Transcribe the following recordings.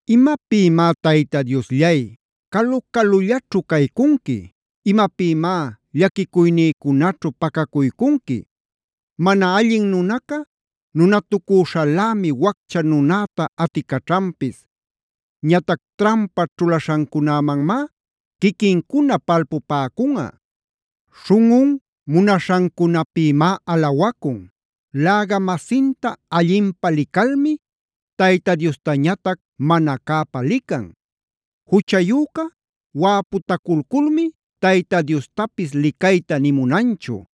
¿Imapïmá Tayta Diosllay, calu-calullaćhu caycunqui? ¿Imapïmá llaquicuynïcunaćhu pacacuycunqui? Mana allin nunaca nunatucüśhalämi waccha nunäta aticaćhanpis. Ñatac trampa ćhulaśhancunämanmá quiquincuna palpupäcunꞌa. Śhunꞌun munaśhancunapïmá alawacun; läga-masinta allinpä licalmi Tayta Diostañatac mana cäpä lican. Juchayüca wäputaculculmi Tayta Diostapis licayta nï munanchu.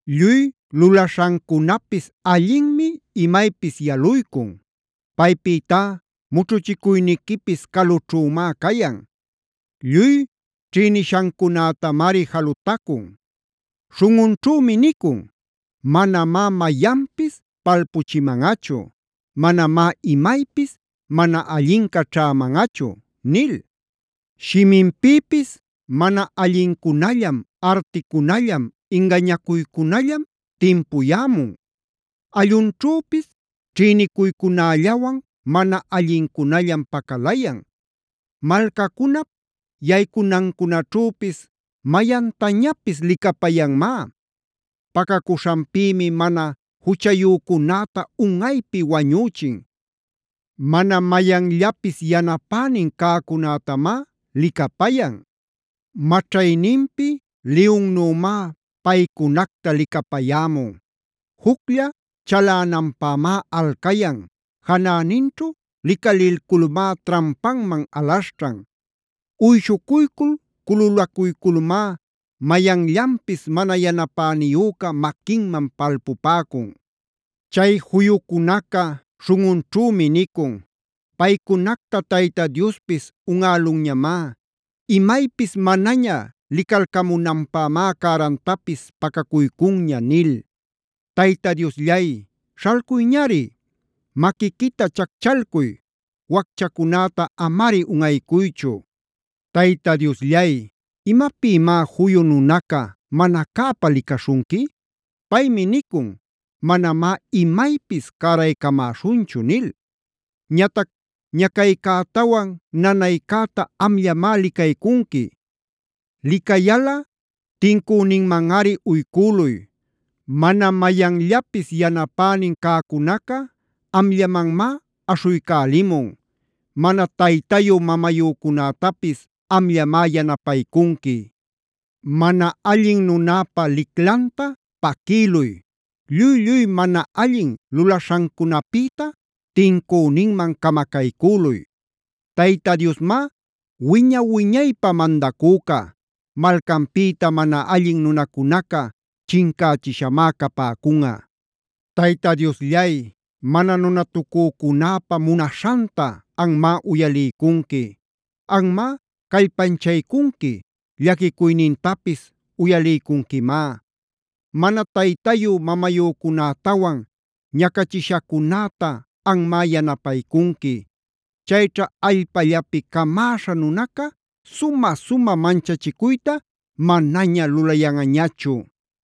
Lluy lulaśhancunapis allinmi imaypis yaluycun. Paypïtá mućhuchicuyniquipis calućhümá cayan. Lluy ćhïniśhancunätamari jalutacun. Śhunꞌunćhümi nicun: “Manamá mayanpis palpuchimanꞌachu. Manamá imaypis mana allinca ćhämanꞌachu” nil. Shiminpïpis mana allincunallam, articunallam, ingañacuycunallam timpuyämun.b allunćhüpis ćhïnicuycunällawan mana allincunallam pacalayan. Malcacunap yaycunancunaćhüpis mayantañapis licapayanmá. Pacacuśhanpïmi mana juchayücunäta unꞌaypi wañüchin. Mana mayanllapis yanapänin cäcunätamá licapayan. Maćhayninpi liyunnümá paycunacta licapayämun, juclla chalänanpämá alcayan, janäninćhu licalilculmá trampanman alaśhćhan. Uyshucuycul cululacuyculmá mayanllanpis mana yanapäniyüca maquinman palpupäcun. Chay juyucunaca śhunꞌunćhümi nicun: “Paycunacta Tayta Diospis unꞌälunñamá. Imaypis manaña licalcamunanpämá cärantapis pacacuycunña” nil. Tayta Diosllay, śhalcuyñari. Maquiquita chacchalcuy. Wacchacunäta amari unꞌaycuychu. Tayta Diosllay, ¿imapïmá juyu nunaca mana cäpä licaśhunqui? Paymi nicun: “Manamá imaypis cäraycamäśhunchu” nil. Ñatac ñacaycätawan nanaycäta amllamá licaycunqui. Licayalꞌa tincüninmanꞌari uycüluy. Mana mayanllapis yanapänin cäcunaca amllamanmá aśhuycälimun. Mana taytayu-mamayücunätapis amllamá yanapaycunqui. Mana allin nunäpa liclanta paquïluy. Lluy-lluy mana allin lulaśhancunapïta tincüninman camacaycüluy. Tayta Diosmá wiña-wiñaypä mandacüca; malcanpïta mana allin nunacunaca chincächiśhamá capäcunꞌa. Tayta Diosllay, mana nunatacücunäpa munaśhanta anmá uyaliycunqui, anmá callpanchaycunqui, llaquicuynintapis uyaliycunquimá. Mana taytayu-mamayücunätawan ñacachishacunäta anmá yanapaycunqui. Chayćha allpallapi camäśha nunaca sumä-sumä manchachicuyta manaña lulayanꞌañachu.